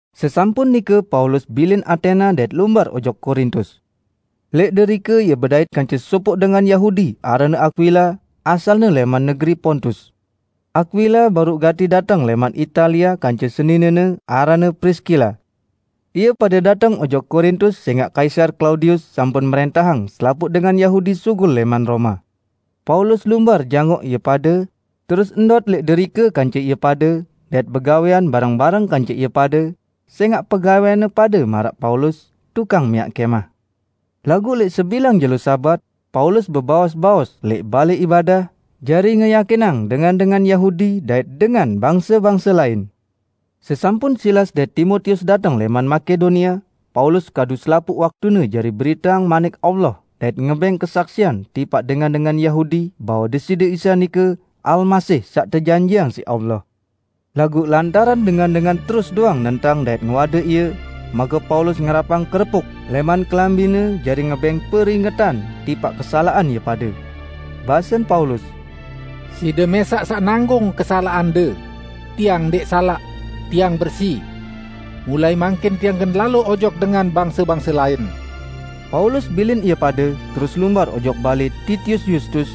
Sesampun nike Paulus bilin Atena dait lumbar ojok Korintus. Lẽq derike ie bedait kance sopoq dengan Yahudi aranne Akwila, asalne lẽman negeri Pontus. Akwila baruq gati dateng lẽman Italia kance seninene aranne Priskila. Ie pade dateng ojok Korintus sẽngaq Kaisar Klaudius sampun mrẽntahang selapuq dengan Yahudi sugul lẽman Roma. Paulus lumbar jangoq ie pade, terus ndot lẽq derike kance ie pade, dait begawẽan bareng-bareng kance ie pade, sẽngaq pegawẽanne pade maraq Paulus, tukang miaq kẽmah. Laguq lẽq sebilang jelo Sabat, Paulus bebaos-baos lẽq balẽ ibadah, jari ngeyakinang dengan-dengan Yahudi dait dengan bangse-bangse lain. Sesampun Silas dait Timotius dateng lẽman Makedonia, Paulus kadu selapuq waktune jari beriteang Manik Allah dait ngebẽng kesaksian tipaq dengan-dengan Yahudi bahwe Deside Isa nike Almasih saq tejanjiqang siq Allah. Laguq lantaran dengan-dengan terus doang nentang dait ngewade ie, make Paulus ngerapang kerepuk lẽman kelambine jari ngebẽng peringetan tipaq kesalaqan ie pade. Basen Paulus, "Side mẽsaq saq nanggung kesalaqande. Tiang ndẽq salaq, tiang bersi! Mulai mangkin tiang gen lalo ojok dengan bangse-bangse lain." Paulus bilin ie pade, terus lumbar ojok balẽ Titius Yustus,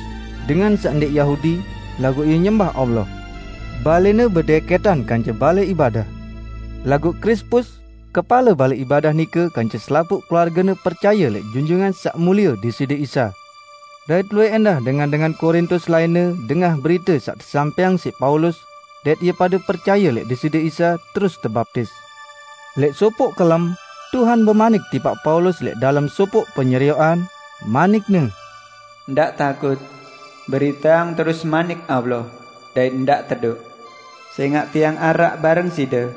dengan saq ndẽq Yahudi, laguq ie nyembah Allah. Balẽne bedẽkẽtan kance balẽ ibadah. Laguq Krispus, kepale balẽ ibadah nike kance selapuq keluargene percaye lẽq Junjungan Saq Mulie Deside Isa. Dait luwẽq ẽndah dengan-dengan Korintus lainne dengah berite saq tesampẽang siq Paulus, dait ie pade percaye lẽq Deside Isa terus tebaptis. Lẽq sopoq kelem, Tuhan bemanik tipaq Paulus lẽq dalem sopoq penyerioqan, manik-Ne, "Ndaq takut! Beriteang terus Manik Allah, dait ndaq tedoq. Sẽngaq Tiang araq bareng side.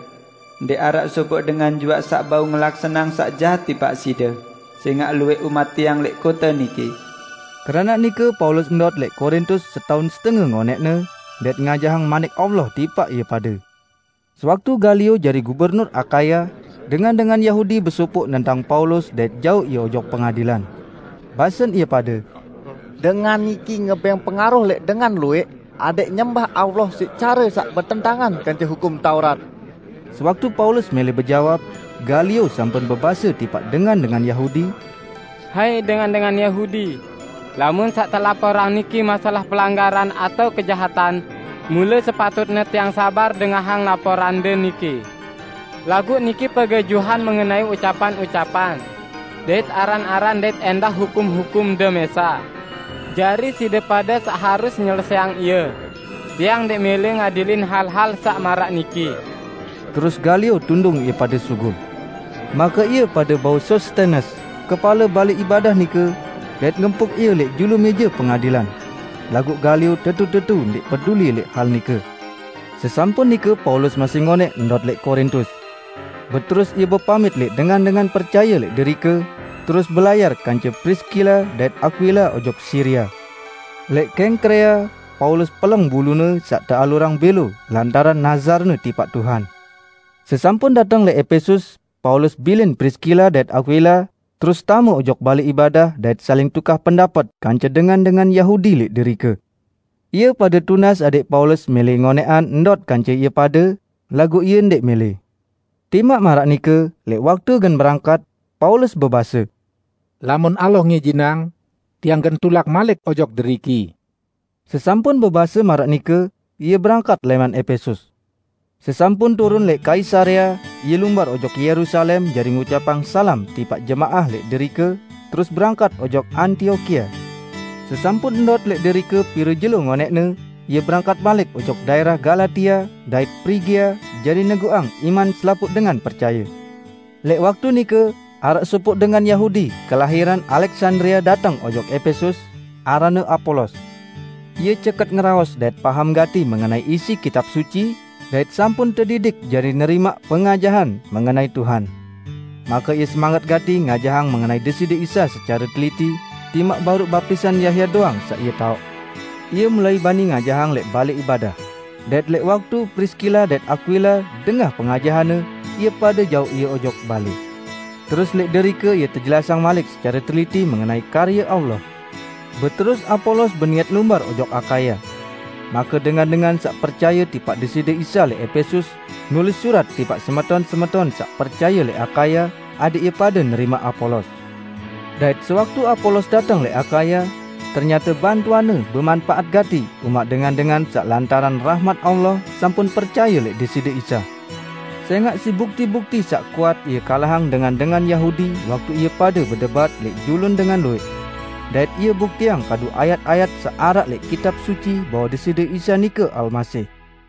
Ndẽq araq sopoq dengan juaq saq bau ngelaksaneang saq jahat tipaq side, sẽngaq luwẽq umat Tiang lẽq kote niki." Keranaq nike Paulus ndot lẽq Korintus setaun setenge ngonẽqne, dait ngajahang Manik Allah tipaq ie pade. Sewaktu Galio jari gubernur Akaya, dengan-dengan Yahudi besopoq nentang Paulus dait jauq ie ojok pengadilan. Basen ie pade, "Dengan niki ngebẽng pengaruh lẽq dengan luwẽq adẽq nyembah Allah siq care saq betentangan kance hukum Taurat!" Sewaktu Paulus mẽlẽ bejawab, Galio sampun bebase tipaq dengan-dengan Yahudi, "Hai dengan-dengan Yahudi! Lamun saq telaporang niki masalah pelanggaran atao kejahatan, mule sepatutne tiang sabar dengahang laporande niki. Laguq niki pegejuhan mengenai ucapan-ucapan dait aran-aran dait ẽndah hukum-hukumde mẽsaq! Jari side pade saq harus nyelesẽang ie. Tiang ndẽq mẽlẽ ngadilin hal-hal saq maraq niki!" Terus Galio tundung ie pade sugul. Make ie pade bau Sostenes, kepale balẽ ibadah nike, dait ngempuk ie lẽq julu mẽje pengadilan. Laguq Galio tetu-tetu ndẽq peduli lẽq hal nike. Sesampun nike Paulus masih ngonẽq ndot lẽq Korintus. Beterus ie bepamit lẽq dengan-dengan percaye lẽq derike, terus belayar kance Priskila dait Akwila ojok Siria. Lẽq Kengkrea, Paulus peleng bulune saq tealurang bẽlo lantaran nazarne tipaq Tuhan. Sesampun dateng lẽq Epesus, Paulus bilin Priskila dait Akwila, terus tame ojok balẽ ibadah dait saling tukah pendapet kance dengan-dengan Yahudi lẽq derike. Ie pade tunas adẽq Paulus mẽlẽ ngonẽqan ndot kance ie pade, laguq ie ndẽq mẽlẽ. Timaq maraq nike, lẽq waktu gen berangkat, Paulus bebase, "Lamun Allah ngijinang, tiang gen tulak malik ojok deriki." Sesampun bebase maraq nike, ie berangkat lẽman Epesus. Sesampun turun lẽq Kaisarea, ie lumbar ojok Yerusalem jari ngucapang salam tipaq jemaah lẽq derike, terus berangkat ojok Antiokia. Sesampun ndot lẽq derike pire jelo ngonẽqne, ie berangkat malik ojok daẽrah Galatia dait Prigia jari neguqang iman selapuq dengan percaye. Lẽq waktu nike, araq sopoq dengan Yahudi kelahiran Aleksandria dateng ojok Epesus, aranne Apolos. Ie ceket ngeraos dait paham gati mengenai isi Kitab Suci, dait sampun tedidik jari nerimaq pengajahan mengenai Tuhan. Make ie semanget gati ngajahang mengenai Deside Isa secare teliti, timaq baruq baptisan Yahya doang saq ie taoq. Ie mulai bani ngajahang lẽq balẽ ibadah, dait lẽq waktu Priskila dait Akwila dengah pengajahanne, ie pade jauq ie ojok balẽ. Terus lẽq derike ie tejelasang malik secare teliti mengenai karye Allah. Beterus Apolos beniat lumbar ojok Akaya. Make dengan-dengan saq percaye tipaq Deside Isa lẽq Epesus, nulis surat tipaq semeton-semeton saq percaye lẽq Akaya adẽq ie pade nerimaq Apolos. Dait sewaktu Apolos dateng lẽq Akaya, ternyate bantuanne bemanpaat gati umaq dengan-dengan saq lantaran rahmat Allah sampun percaye lẽq Deside Isa. Sẽngaq siq bukti-bukti saq kuat ie kalahang dengan-dengan Yahudi waktu ie pade bedebat lẽq julun dengan luwẽq. Dait ie buktiang kadu ayat-ayat saq araq lẽq Kitab Suci bahwe Deside Isa nike Almasih.